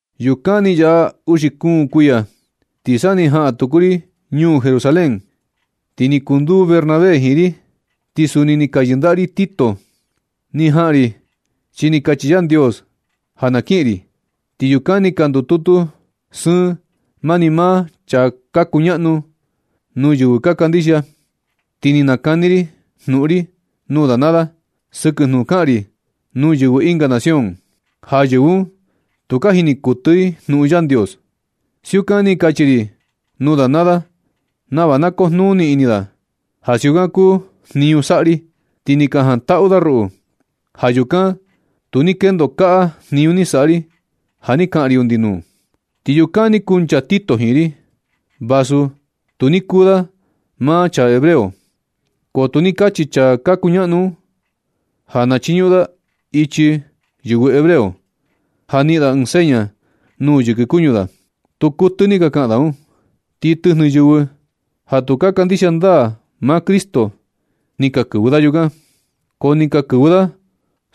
Yukan ni yaꞌa uxi kuun kuiya ti sa ni jaꞌan tuku ri ñuu Jerusalén. Ti ni kunduu Bernabé jiin ri, ti suni ni ka yɨndaꞌa ri Tito. Ni jaꞌan ri chi ni kachi Yandios ja na kiꞌin ri. Ti yukan ni ka ndututu sɨɨn mani maa chaa ka kuñaꞌnu nuu yɨvɨ ka kandixia. Ti ni nakani ri jnuꞌun ri nuu da naa da sɨkɨ jnuꞌun kaꞌan ri nuu yɨvɨ ɨnga nación, ja yɨvɨ un tu ka jini kuɨtɨ i jnuꞌun Yandios. Siukan ni kachi ri nuu da naa da nava na kujnuni ini da ja siukan kuu jniñu saꞌa ri. Ti ni ka jantaꞌu da ruꞌu. Ja yukan tu ni kendo kaꞌa jniñu ni saꞌa ri ja ni kaꞌan ri undi nuu. Ti yukan ni kuncha Tito jiin ri. Vasu tu ni kuu da maa chaa hebreo, ko tu ni kachi chaa ka kuñaꞌnu un ja na chiñuꞌun da ichi yɨvɨ hebreo, ja niꞌin da ɨɨn seña nuu yɨkɨ kuñu da. Tu kuɨtɨ ni ka kaꞌan da un. Ti tɨjnɨ yɨvɨ ja tu ka kandixia ndaa maa Cristo ni ka kɨvɨ da yukan, ko ni ka kɨvɨ da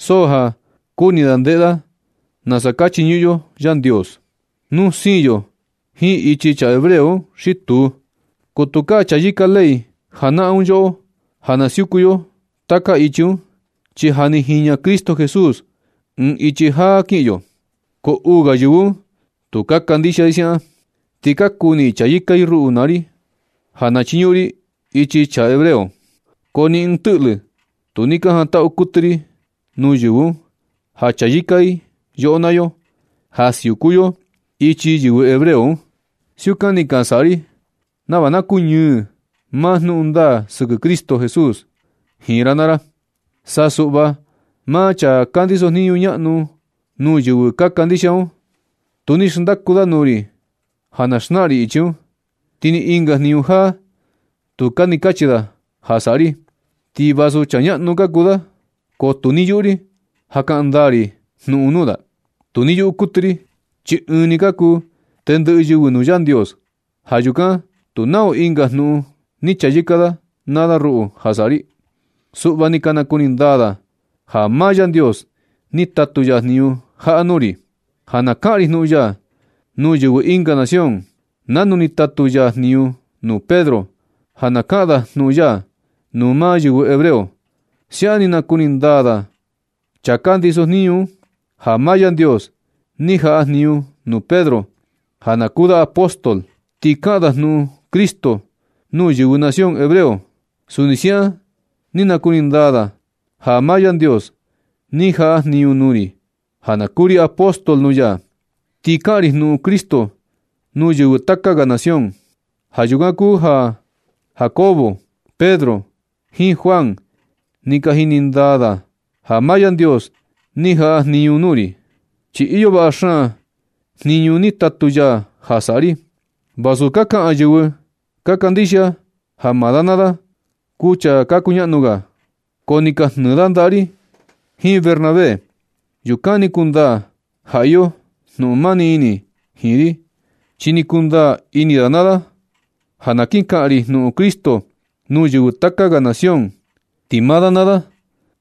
so ja kuni da ndeꞌe da nasa ka chiñuꞌun yo Yandios, nu siin yo jiin ichi chaa hebreo un xi tuu. Ko tukaa chayɨka ley janaꞌan un yoꞌo ja na siuku yo taka ichi un, chi ja ni jiña Cristo Jesús ɨɨn ichi jaa kiꞌin yo. Ko uu ga yɨvɨ un tu ka kandixia i siaꞌan. Ti ka kuni i chayɨka i ruꞌu naa ri ja na chiñuꞌun ri ichi chaa hebreo. Ko ni ɨɨn tɨꞌlɨ tu ni ka jantaꞌu kuɨtɨ ri nuu yɨvɨ un ja chayɨka i yoꞌo naa yo, ja siuku yo ichi yɨvɨ hebreo un. Siukan ni ka saꞌa ri nava na kuñɨɨ maa jnuꞌun ndaa sɨkɨ Cristo Jesús jiin ra naa ra. Sa suꞌva maa chaa ka ndisojniñu ñaꞌnu nuu yɨvɨ ka kandixia un, tu ni xndaku da nuu ri ja na xnaꞌan ri ichi un. Ti ni ɨnga jniñu jaa, tukaa ni kachi da ja saꞌa ri. Ti vasu chaa ñaꞌnu ka kuu da, ko tu ni yuꞌu ri ja kaꞌan ndaa ri jnuꞌun nuu da. Tu ni yuꞌu kuɨtɨ ri, chi ɨɨn ni ka kuu tendɨꞌɨ yɨvɨ nuu Yandios. Ja yukan tu nau ɨnga jnuꞌun ni chayɨka da naa da ruꞌu ja saꞌa ri. Suꞌva ni ka nakuni ndaa da ja maa Yandios ni tatu ya jniñu jaꞌa nuu ri, ja na kaꞌan ri jnuꞌun ya nuu yɨvɨ ɨnga nación nanu ni tatu ya jniñu nuu Pedro ja na kaꞌan da jnuꞌun ya nuu maa yɨvɨ hebreo. Siaꞌan ni nakuni ndaa chaa ka ndisojniñu un, ja maa Yandios ni jaꞌa jniñu nuu Pedro ja na kuu da apóstol, ti kaꞌan da jnuꞌun Cristo nuu yɨvɨ nación hebreo. Suni siaꞌan ni nakuni ndaa da ja maa Yandios ni jaꞌa jniñu nuu ri ja na kuu ri apóstol nuu ya, ti kaꞌan ri jnuꞌun Cristo nuu yɨvɨ taka ga nación. Ja yukan kuu ja Jacobo, Pedro, jiin Juan ni ka jini ndaa da ja maa Yandios ni jaꞌa jniñu nuu ri, chi iyo vaꞌa xaan jniñu ni tatu ya ja saꞌa ri. Vasu ka kaꞌan yɨvɨ ka kandixia ja maa da naa da kuu chaa ka kuñaꞌnu ga, ko ni ka jnɨɨ da ndaꞌa ri jiin Bernabé. Yukan ni kundaa ja iyo jnuꞌun mani ini jiin ri, chi ni kundaa ini da naa da ja na kin kaꞌan ri jnuꞌun Cristo nuu yɨvɨ taka ga nación, ti maa da naa da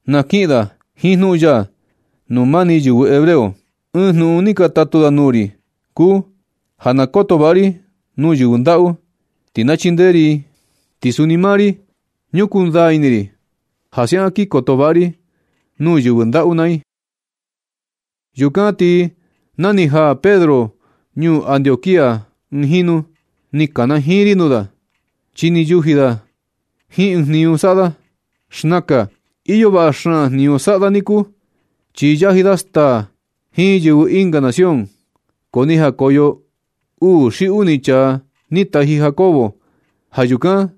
na kiꞌin da jiin jnuꞌun ya nuu mani yɨvɨ hebreo. Ɨɨn jnuꞌun ni ka tatu da nuu ri kuu ja na koto vaꞌa ri nuu yɨvɨ ndaꞌu, ti na chindee ri i. Ti suni maa ri, ñukuu ndaa ini ri ja siaꞌan kin koto vaꞌa ri nuu yɨvɨ ndaꞌu naa i. Yukan ti na ni jaa Pedro ñuu Antioquía ɨɨn jinu, ni kanajiin ri nuu da, chi ni yuji da jiin ɨɨn jniñu saꞌa da. Xnakan iyo vaꞌa xaan jniñu saꞌa da niku, chi yaji da staa jiin yɨvɨ ɨnga nación. Ko ni jakoyo uu xi uni chaa ni taji Jacobo. Ja yukan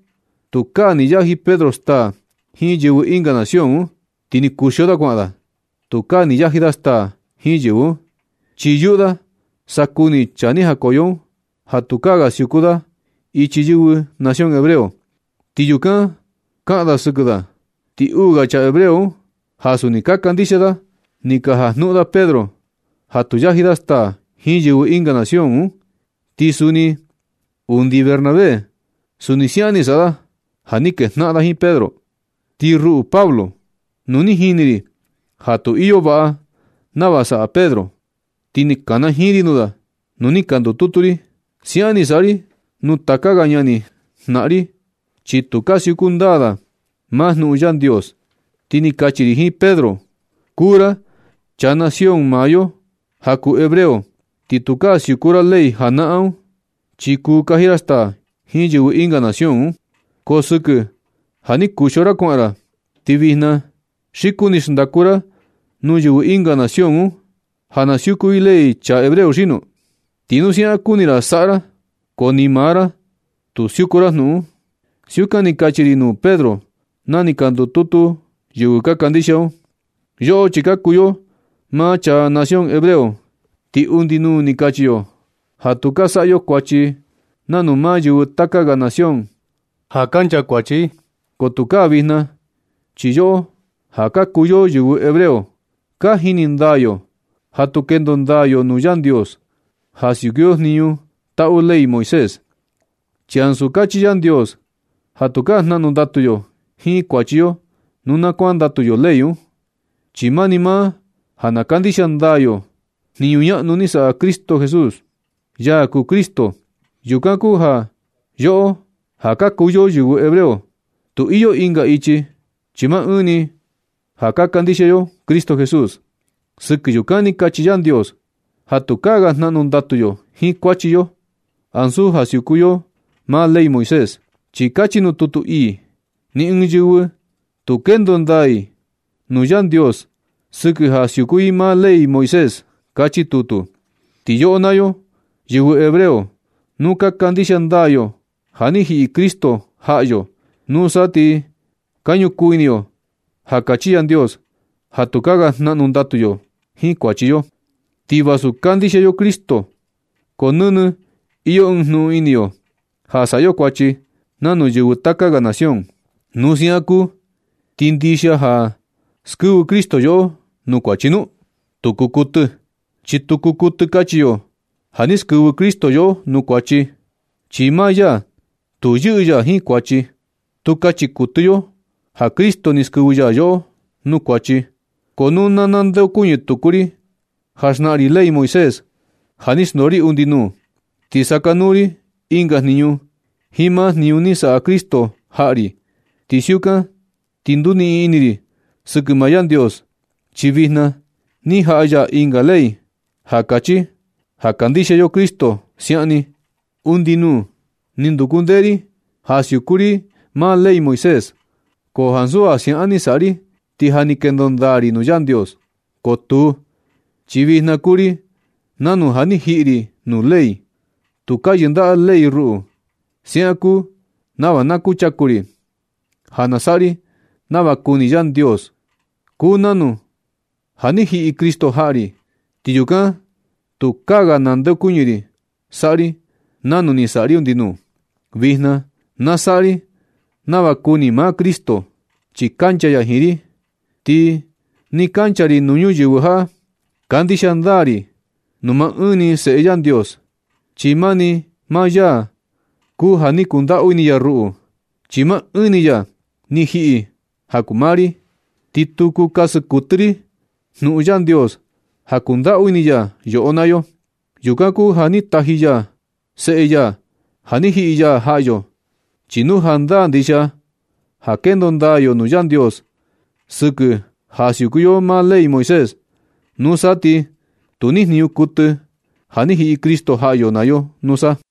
tukaa ni yaji Pedro staa jiin yɨvɨ ɨnga nación un, ti ni kuxio da kuaꞌan da. Tukaa ni yaji da staa jiin yɨvɨ un, chi yuꞌu da sa kuni chaa ni jakoyo un ja tukaa ga siuku da ichi yɨvɨ nación hebreo. Ti yukan kaꞌan da sɨkɨ da. Ti uu ga chaa hebreo un ja suni ka kandixia da, ni ka jajnuꞌun da Pedro ja tu yaji da staa jiin yɨvɨ ɨnga nación un. Ti suni undi Bernabé suni siaꞌan ni saꞌa da ja ni kejnaꞌan da jiin Pedro. Ti ruꞌu Pablo, nu ni jini ri ja tu iyo vaꞌa nava saꞌa Pedro, ti ni kanajiin ri nuu da nuu ni ka ndututu ri. Siaꞌan ni saꞌa ri nuu taka ga ñani jnaꞌan ri un, chi tukaa siuku ndaa da maa jnuꞌun Yandios, ti ni kachi ri jiin Pedro: “Kuu ra chaa nación maa yo ja kuu hebreo, ti tukaa siuku ra ley janaꞌan un, chi kuu kaji ra staa jiin yɨvɨ ɨnga nación un. Ko sɨkɨ ja ni kuxio ra kuaꞌan ra, ti vijna ¿xi kuni xndaku ra nuu yɨvɨ ɨnga nación un ja na siuku i ley chaa hebreo xino? Xi nu siaꞌan kuni ra saꞌa ra, ko ni maa ra tu siuku jnuꞌun un.” Siukan ni kachi ri nuu Pedro na ni ka ndututu yɨvɨ ka kandixia un. Yoꞌo, chi ka kuu yo maa chaa nación hebreo, ti undi nuu ni kachi yo ja tu ka saꞌa yo kuachi nanu maa yɨvɨ taka ga nación ja ka nchakuachi i. Ko tukaa vijna. Chi yoꞌo ja ka kuu yo yɨvɨ hebreo, ka jini ndaa yo ja tu kendo ndaa nuu Yandios ja siuku yo jniñu taꞌu ley Moisés. Chi ansu kachi Yandios ja tukaa jnaꞌnu ndatu yo jiin kuachi yo nu na kuandatu yo ley un, chi mani maa ja na kandixia ndaa yo jniñu ñaꞌnu ni saꞌa Jesús, ya kuu Cristo. Yukan kuu ja yoꞌo ja ka kuu yo yɨvɨ hebreo, tu iyo ɨnga ichi, chi maa ɨɨn ni ja ka kandixia yo Cristo Jesús. Sɨkɨ yukan ti kachi Yandios ja tukaa ga jnaꞌnu ndatu yo jiin kuachi yo, ansu ja siuku yo maa ley Moisés. Chi kachi nuu tutu ii: “Ni ɨɨn yɨvɨ tu kendo ndaa i nuu Yandios sɨkɨ ja siuku i maa ley Moisés”, kachi tutu. Ti yoꞌo naa yo, yɨvɨ hebreo, nu ka kandixia ndaa yo ja ni jiꞌi Cristo jaꞌa yo, nusa ti ka ñukuu ini yo ja kachi Yandios ja tukaa ga jnaꞌnu ndatu yo jiin kuachi yo. Ti vasu kandixia yo Cristo, ko nɨnɨ iyo ɨɨn jnuꞌun ini yo ja saꞌa yo kuachi nanu yɨvɨ taka ga nación. Nu siaꞌan kuu, ¿ti ndixia ja skɨvɨ Cristo yoꞌo nuu kuachi nu? ¡Tu kuu kuɨtɨ! Chi tu kuu kuɨtɨ kachi yo ja ni skɨvɨ Cristo yoꞌo nuu kuachi, chi maa ya tu yɨꞌɨ ya jiin kuachi. Tu kachi kuɨtɨ yo ja Cristo ni skɨvɨ ya yoꞌo nuu kuachi. Ko nu na nandeokuñɨ tuku ri ja xnaꞌan ri ley Moisés ja ni xndoo ri undi nuu, ti sakanuu ri ɨnga jniñu jiin maa jniñu ni saꞌa Cristo jaꞌa ri. Nu siukan ti nduniꞌin ini ri sɨkɨ maa Yandios, chi vijna ni jaꞌa ya ɨnga ley ja kachi ja kandixia yo Cristo siaꞌan ni. Undi nuu, suꞌva ni nduku ndee ri ja siuku ri maa ley Moisés, ko ansu ja siaꞌan ni saꞌa ri ti ja ni kendo ndaa ri nuu Yandios. Ko tuu, chi vijna kuu ri nanu ja ni jiꞌi ri nuu ley. Tukaa yɨndaꞌa ley ruꞌu. Siaꞌan kuu nava na kuchaku ri ja na saꞌa ri nava kuni Yandios. Kuu nanu ja ni jiꞌi Cristo jaꞌa ri, ti yukan tukaa ga nandeokuñɨ ri saꞌa ri nanu ni saꞌa ri undi nuu. Vijna na saꞌa ri nava kuni maa Cristo, chi kancha ya jiin ri. Ti nɨ kancha ri nuu ñuyɨvɨ jaꞌa, kandixia ndaa ri nuu maa ɨɨn ni Seꞌe Yandios. Chi mani maa ya kuu ja ni kundaꞌu ini ya ruꞌu, chi maa ɨɨn ni ya ni jiꞌi ja kuu maa ri. Ni tu kuu kasɨ kuɨtɨ ri jnuꞌun Yandios ja kundaꞌu ini ya yoꞌo naa yo. Yukan kuu ja ni taji ya seꞌe ya ja ni jiꞌi ya jaꞌa yo. Chi nu jandaa ndixia ja kendo ndaa yo nuu Yandios sɨkɨ ja siuku yo maa ley Moisés, nusa ti tu ni jniñu kuɨtɨ ja ni jiꞌi Cristo jaꞌa yo naa yo nusa.